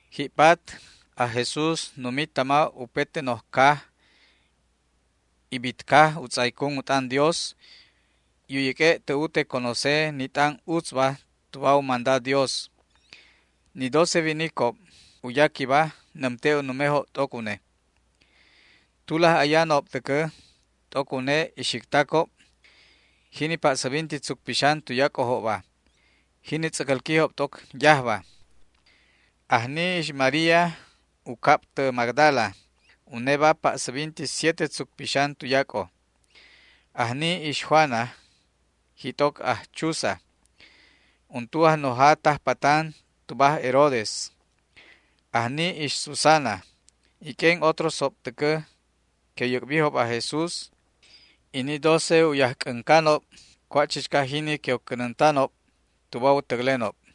Ji'pat aj Jesús numi tama upete noj caj y bit caj u tz'aycun u t'an Dios y u yäq'ue' tä ute conoce ni t'an utzba tuba u manda Dios. Ni doce winicob u yaquiba nämte' u numejob t'oc une. Tulaj ayanob täcä t'oc une ixictacob, jini pa'säbinti tzuc pixan tuyac'ojobba, jini tz'äcälquijob t'oc yajba. Ajni ix María, u cab tä Magdala, uneba pa'säbinti siete tzuc pixan tuyac'o. Ajni ix Juana, jit'oc aj Chuza, untu ajnoja tajpatan tuba aj Herodes. Ajni ix Susana y q'uen otrosob täcä que u yäc'bijob aj Jesús y ni doce u yajc'äncanob cua' chichca jini que u cänäntanob tuba u täclenob.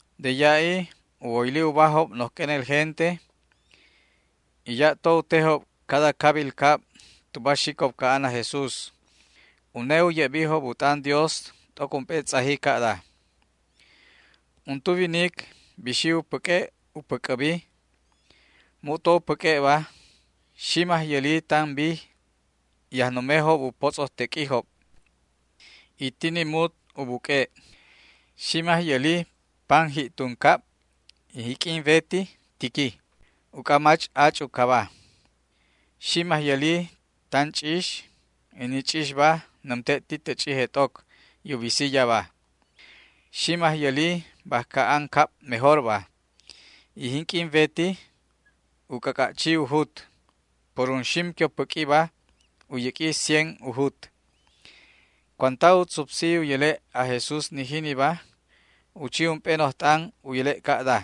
De ya'i u woyli ubajob noj q'uenel gente, y ya'to u tejob cada cabil cab tuba xicob ca'an aj Jesús. Une u ye'bijob u t'an Dios t'oc ump'e tz'aji ca'da: ―Untu winic bixi u päq'ue' u päc'äbi. Mu'to u päq'ue'ba, ximaj yäli tan bij y ajnumejob u potz'ojteq'uijob, y ti ni mut u buq'ue'. Ximaj yäli pan ji'tun cab y jinq'uin wetiba tiqui, uc'a mach ach' u caba. Ximaj yäli tan ch'ix y ni ch'ixba nämte' ti tä ch'ije t'oc y u bisi yaba. Ximaj yäli bajca an cab mejorba, y jinq'uin weti u c'ac'a' chi u jut. Por unxim que pä'quiba u yäq'ui cien u jut. Cuanta u tzupsi u yäle' aj Jesús ni jiniba, u chi ump'e noj t'an u yäle' ca'da: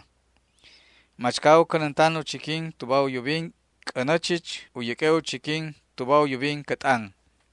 ―Machca u cänäntan u chiquin tuba u yubin c'änä chich u yäq'ue' u chiquin tuba u yubin cä t'an.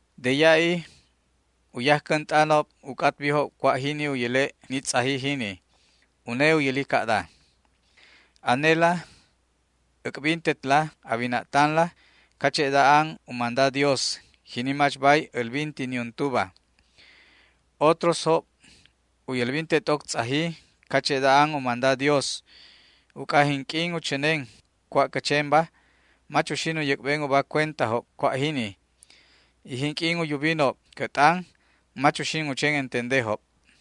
De ya'i u yajcänt'anob u c'atbijob cua' jini u yäle' ni tz'aji jini. Une u yäli ca'da: ―Anela äc'bintetla a wina'tanla cache'da an u manda Dios, jini mach bay älbinti niuntuba. Otrosjob u yälbinte t'oc tz'aji cache'da an u manda Dios, uc'a jinq'uin u chänen cua' cä chenba mach uxin u yäc'ben uba cuentajob cua' jini, y jinq'uin u yubinob cä t'an mach uxin u chen entendejob.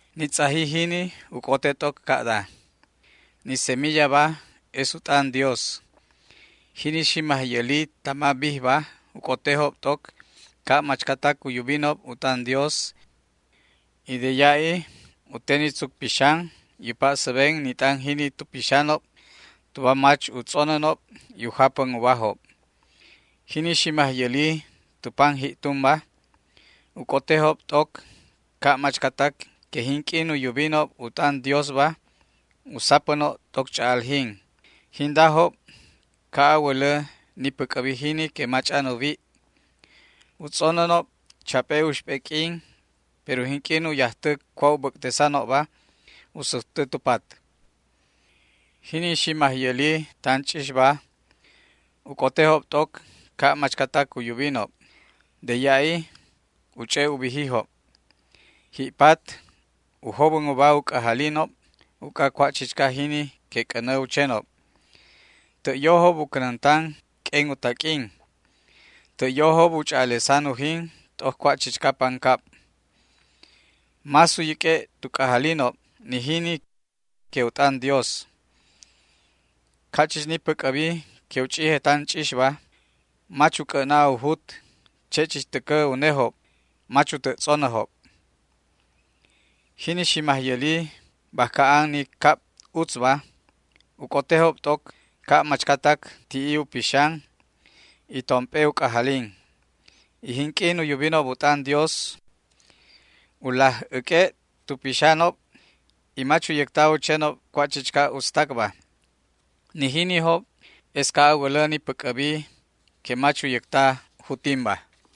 ’Ni tz'aji jini u c'ote t'oc ca'da: Ni semillaba es u t'an Dios. Jini ximaj yäli tama bijba u c'otejob t'oc ca' machcatac u yubinob u t'an Dios y de ya'i u te ni tzuc pixan y u pa'säben ni t'an jini tu pixanob tuba mach u tz'onänob y u japän ubajob. Jini ximaj yäli tu pam ji'tunba u c'otejob t'oc ca' machcatac que jinq'uin u yubinob u t'an Diosba u sapänob t'oc ch'a'aljin. Jindajob ca' a wälä ni päc'äbi jini que mach'an u wi'. U tz'onänob chap'e uxp'e q'uin, pero jinq'uin u yajtä cua' u bäc'tesanobba u sujtä tu pat. Jini ximaj yäli tan ch'ixba u c'otejob t'oc ca' machcatac u yubinob. De ya'i u ch'e' u bijijob. Ji'pat u jobän uba u c'ajalinob uc'a cua' chichca jini que c'änä u chenob. Tä' yojob u cänäntan q'uen u taq'uin. Tä' yojob u ch'a'alesan ujin t'oc cua' chichca pancab. Más u yäq'ue' tu c'ajalinob ni jini que u t'an Dios. Ca' chich ni päc'äbi que u ch'ije tan ch'ixba mach u c'ä'na u jut, che' chich täcä unejob mach u tä' tz'onäjob. Jini ximaj yäli bajca an ni cab utzba u c'otejob t'oc ca' machcatac ti'i u pixan y tomp'e u c'ajalin, y jinq'uin u yubinob u t'an Dios u laj äq'ue' tu pixanob y mach u yäcta u chenob cua' chichca utztacba. Ni jinijob es ca' a wälä ni päc'äbi que mach u yäcta jutinba.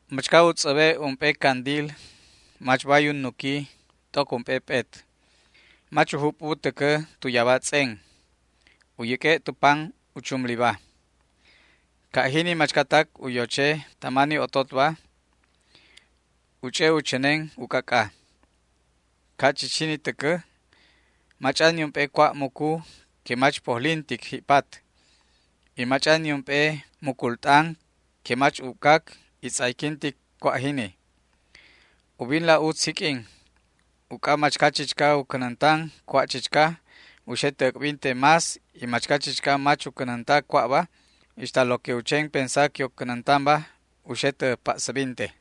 ’Machca u tz'äbe' ump'e candil mach bay u nuquí t'oc ump'e p'et. Mach u jup'u täcä tu yaba tz'en. U yäq'ue' tu pam u chumliba. Ca' jini machcatac u yoche tama ni ototba u ch'e' u chänen u c'ac'a. Ca' chich jini täcä, mach'an niump'e cua' mucu que mach pojlintic ji'pat, y mach'an niump'e mucul t'an que mach ubcac y tz'ayquintic cua' jini. ’Ubinla utz jiq'uin, uc'a machca chichca u cänäntan cua' chichca u xe tä äc'binte más y machca chichca mach u cänänta cua'ba, ixta lo que u chen pensa que u cänäntanba u xe tä pa'säbinte.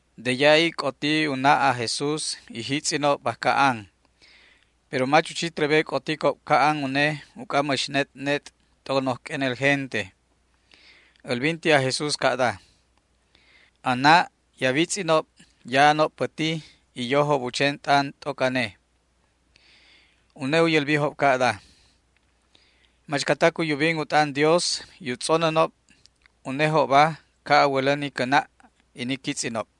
De ya'i c'oti u na' aj Jesús y jitz'inob bajca an, pero mach u chi trebe c'oticob ca'an une uc'a mäx net' net' t'oc noj q'uenel gente. Älbinti aj Jesús ca'da: ―A na' y a witz'inob ya'anob päti y yojob u chen t'an t'oc ane. Une u yälbijob ca'da: ―Machcatac u yubinob u t'an Dios y u tz'onänob, unejobba ca' a wälä ni cä na' y ni quitz'inob.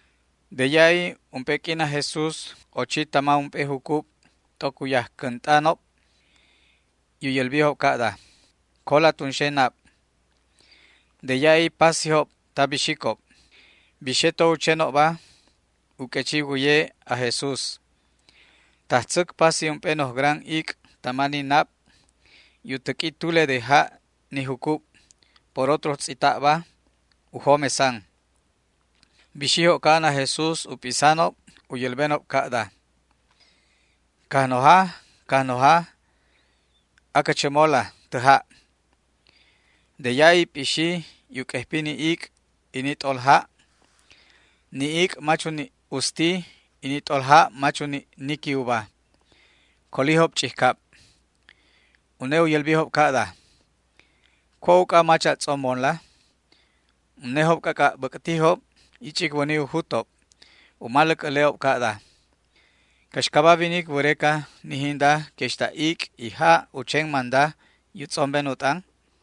De ya'i ump'e q'uin aj Jesús ochi tama ump'e jucub t'oc u yajcänt'anob y u yälbijob ca'da: ―Cola tunxe nab. De ya'i pasijob ta bixicob. Bixe to u chenobba, u q'uechi wäye aj Jesús. Tajtzäc pasi ump'e noj gran ic' tama ni nab y u täq'ui tule de ja' ni jucub. Por otro tz'ita'ba u jomesan. Bixijob ca'an aj Jesús u p'isanob u yälbenob ca'da: ―¡Cajnoja, Cajnoja, acä chämola tä ja'! De ya'i p'ixi y u q'uejpi ni ic' y ni t'olja'. Ni ic' mach u ni' usti y ni t'olja' mach u ni' niqui uba. Colijob ch'ijcab. Une u yälbijob ca'da: ―¿Cua' uc'a mach a tz'ombonla? Unejob c'ac'a' bäc'tijob y ch'icwäni u jutob. U maläc äle'ob ca'da: ―¿Caxcaba winic wäreca ni jinda que ixta ic' y ja' u chen manda y u tz'omben u t'an?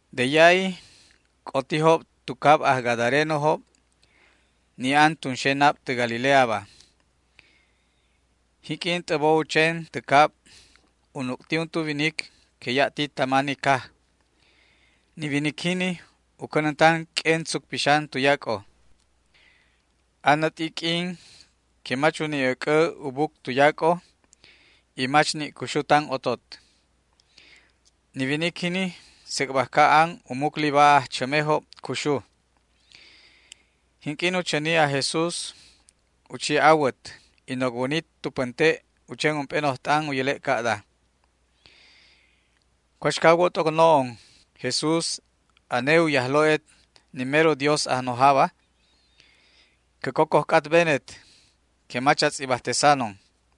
De ya'i c'otijob tu cab aj gadarenojob, ni an tunxe nab tä Galileaba. Jinq'uin t'äbo u chen tä cab u nuc'ti untu winic que ya' ti tama ni caj. Ni winic jini u cänäntan q'uen tzuc pixan tuyac'o. Anät'i q'uin que mach u ni' äc'ä u buc tuyac'o y mach ni' cuxu tan otot. Ni winic jini sec' bajca an u mucliba ajchämejob cuxu. Jinq'uin u chäni aj Jesús, u chi awät y nocwäni tu pänte' u chen ump'e noj t'an u yäle' ca'da: ―¿Cuaxca a wo t'oc no'on, Jesús, ane u Yajlo'et ni mero Dios Ajnojaba? Cä cocoj c'atbenet que mach a tz'ibajtesanon.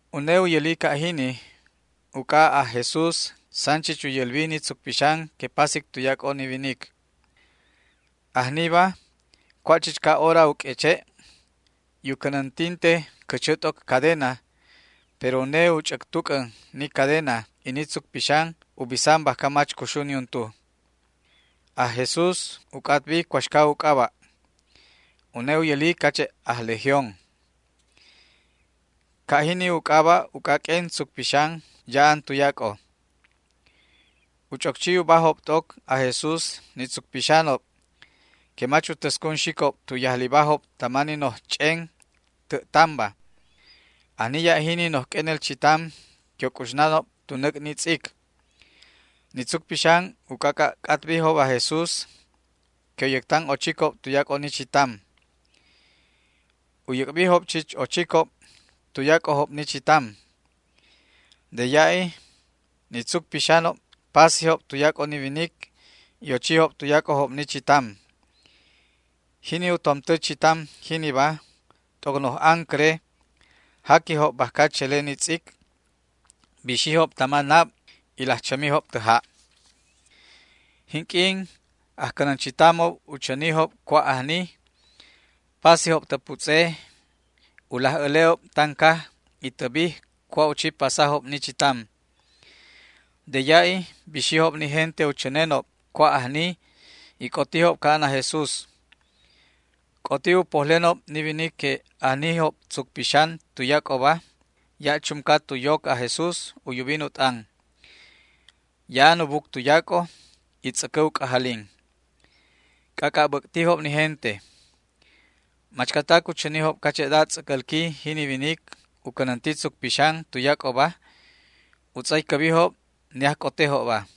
Une u yäli ca' jini uc'a aj Jesús san chich u yälbi ni tzuc pixan que pasic tuyac'o ni winic. Ajniba cua' chichca hora u q'ueche', y u cänäntinte cächä t'oc cadena, pero une u ch'äctuc'än ni cadena y ni tzuc pixan u bisan bajca mach cuxu niuntu. Aj Jesús u c'atbi cuaxca u c'aba'. Une u yäli cache' aj Legión. Ca' jini u c'aba' uc'a q'uen tzuc pixanob ya'an tuyac'o. U ch'oc chi ubajob t'oc aj Jesús ni tzuc pixanob que mach u täscun xicob tu yajlibajob tama ni noj ch'en tä' tamba. Ajni ya' jini noj q'uenel chitam que u c'uxnanob tu näc' ni tz'ic. Ni tzuc pixan u c'ac'a' c'atbijob aj Jesús que u yäctan ochicob tuyac'o ni chitam. U yäc'bijob chich ochicob tuyac'ojob ni chitam. De ya'i ni tzuc pixanob pasijob tuyac'o ni winic y ochijob tuyac'ojob ni chitam. Jini u tomtä chitam jiniba t'oc noj ancäre jaquijob bajca chele ni tz'ic, bixijob tama nab y laj chämijob tä ja'. Jinq'uin ajcänänchitamob u chänijob cua' ajni, pasijob tä putz'e u laj äle'ob tan caj y tä bij cua' u chi pasajob ni chitam. De ya'i bixijob ni gente u chänenob cua' ajni y c'otijob ca'an aj Jesús. C'oti u pojlenob ni winic que ajnijob tzuc pixan tuyac'oba ya' chumca tu yoc aj Jesús u yubin u t'an. Ya'an u buc tuyac'o y tz'äcä u c'ajalin. C'ac'a' bäc'tijob ni gente. Machcatac u chänijob cache'da tz'äcälqui jini winic u cänänti tzuc pixan tuyac'oba u tz'aycäbijob ni ajc'otejobba.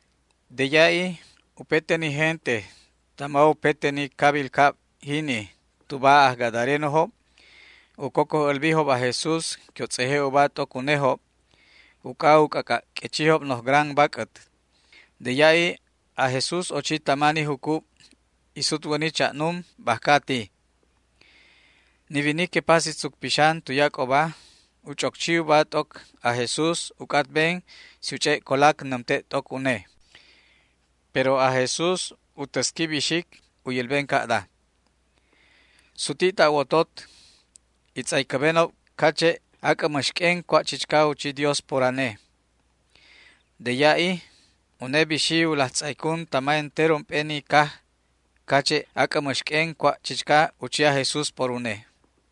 De ya'i upete ni gente tama upete ni cabil cab jini tuba aj gadarenojob u cocoj älbijob aj Jesús que u tz'eje' uba t'oc unejob, uc'a u c'ac'a' q'uechijob noj gran bac'ät. De ya'i aj Jesús ochi tama ni jucub y sutwäni cha'num bajca ati. Ni winic que pasi tzuc pixan tuyac'oba u ch'oc chi uba t'oc aj Jesús u c'atben si u ch'e' colac nämte' t'oc une, pero aj Jesús u täsqui bixic u yälben ca'da: ―Suti' ta' wotot y tz'aycäbenob cache' ac'ä mäx q'uen cua' chichca u chi Dios por ane. De ya'i une bixi u laj tz'aycun tama entero ump'e ni caj cache' ac'ä mäx q'uen cua' chichca u chi aj Jesús por une.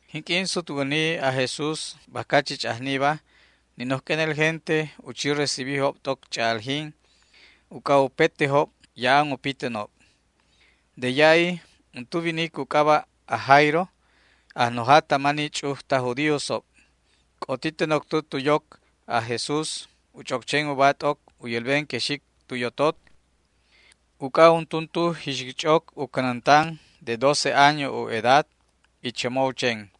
Jinq'uin sutwäni aj Jesús bajca chich ajniba ni noj q'uenel gente u chi recibijob t'oc ch'a'aljin uc'a upetejob ya'an u pitänob. De ya'i untu winic u c'aba' aj Jairo, ajnoja tama ni ch'uj taj judíosob, c'oti tä noctä tu yoc aj Jesús u ch'oc chen uba t'oc u yälben que xic tu yotot, uc'a u cänäntan untuntu jixic ch'oc de doce año u edad, y chämo u chen.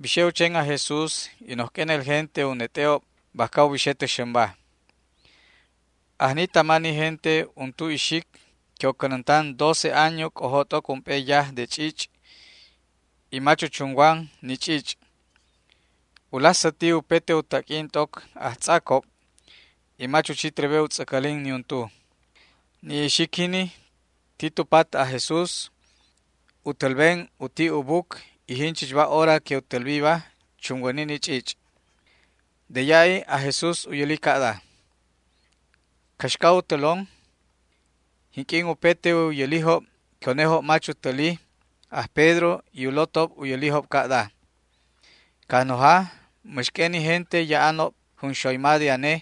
Bixe u chen aj Jesús y noj q'uenel gente u net'e'ob bajca u bixe tä xämba. Ajni tama ni gente untu ixic que u cänäntan doce año c'ojo t'oc ump'e yaj de ch'ich', y mach u chunwan ni ch'ich'. U laj säti upete u taq'uin t'oc ajtz'acob y mach u chi trebe u tz'äcälin niuntu. Ni ixic jini ti tu pat aj Jesús u tälben u ti' u buc, y jinchichba hora que u tälbiba chunwäni ni ch'ich'. De ya'i aj Jesús u yäli ca'da: ―¿Caxca u tälon? Jinq'uin upete u yälijob que unejob mach u täli, aj Pedro y u lotob u yälijob ca'da: ―Cajnoja, mäx q'uen ni gente ya'anob junxoyma de ane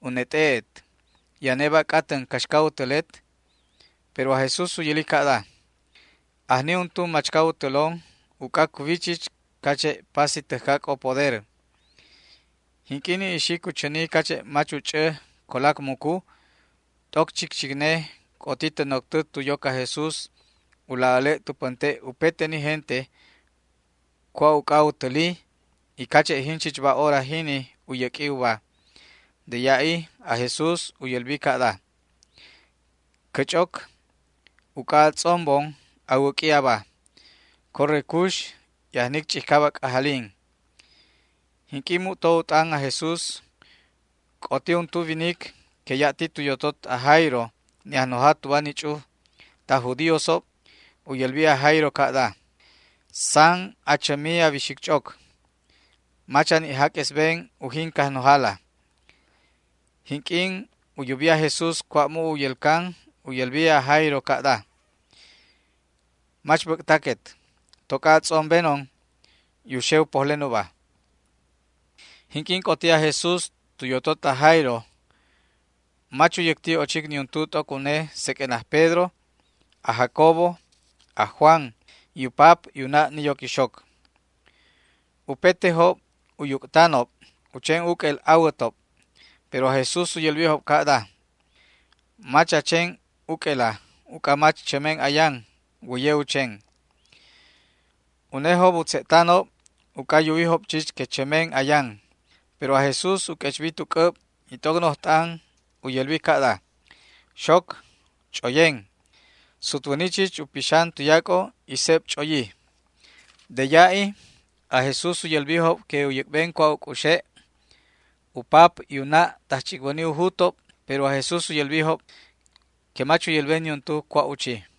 u net'e'et, ¿y aneba a c'atän caxca u tälet? Pero aj Jesús u yäli ca'da: ―Ajni untu machca u tälon, uc'a cuwi chich cache' pasi täjcac'o poder. Jinq'uin ni ixic u chäni cache' mach u ch'ä colac mucu, t'oc chicchicne c'oti tä noctä tu yoc aj Jesús u laj äle' tu pänte' upete ni gente cua' uc'a u täli, y cache' jinchichba hora jini u yäq'ui uba. De ya'i aj Jesús u yälbi ca'da: ―Cä ch'oc, uc'a a tz'ombon, a wäq'ui aba. Corre cux y ajnic ch'ijcab a c'ajalin. Jinq'uin mu'to u t'an aj Jesús c'oti untu winic que ya' ti tu yotot aj Jairo, ni ajnoja tuba ni ch'uj taj judíosob. U yälbi aj Jairo ca'da: ―San achämi a wixic ch'oc. Mach a ni' jaq'uesben ujin Cajnojala. Jinq'uin u yubi aj Jesús cua' mu' u yälcan u yälbi aj Jairo ca'da: ―Mach bäc'taquet, toc'a a tz'ombenon y u xe u pojlen uba. Jinq'uin c'oti aj Jesús tu yotot aj Jairo, mach u yäcti ochic niuntu t'oc une seq'uen aj Pedro, aj Jacobo, aj Juan, y u pap y u na' ni yoc ixoc. Upetejob u yuc'tanob u chen uq'uel awätob, pero aj Jesús u yälbijob ca'da: ―Mach a chen uq'uela uc'a mach chämen ayan, wäye u chen. Unejob u tze'tanob uc'a yuwijob chich que chämen ayan. Pero aj Jesús u q'uechbi tu c'äb y t'oc noj t'an u yälbi ca'da: ―Xoc, ch'oyen. Sutwäni chich u pixan tuyac'o y seb ch'oyi. De ya'i aj Jesús u yälbijob que u yäc'ben cua' u c'uxe'. U pap y u na' tajch'icwäni u jutob, pero aj Jesús u yälbijob que mach u yälben niuntu cua' u chi.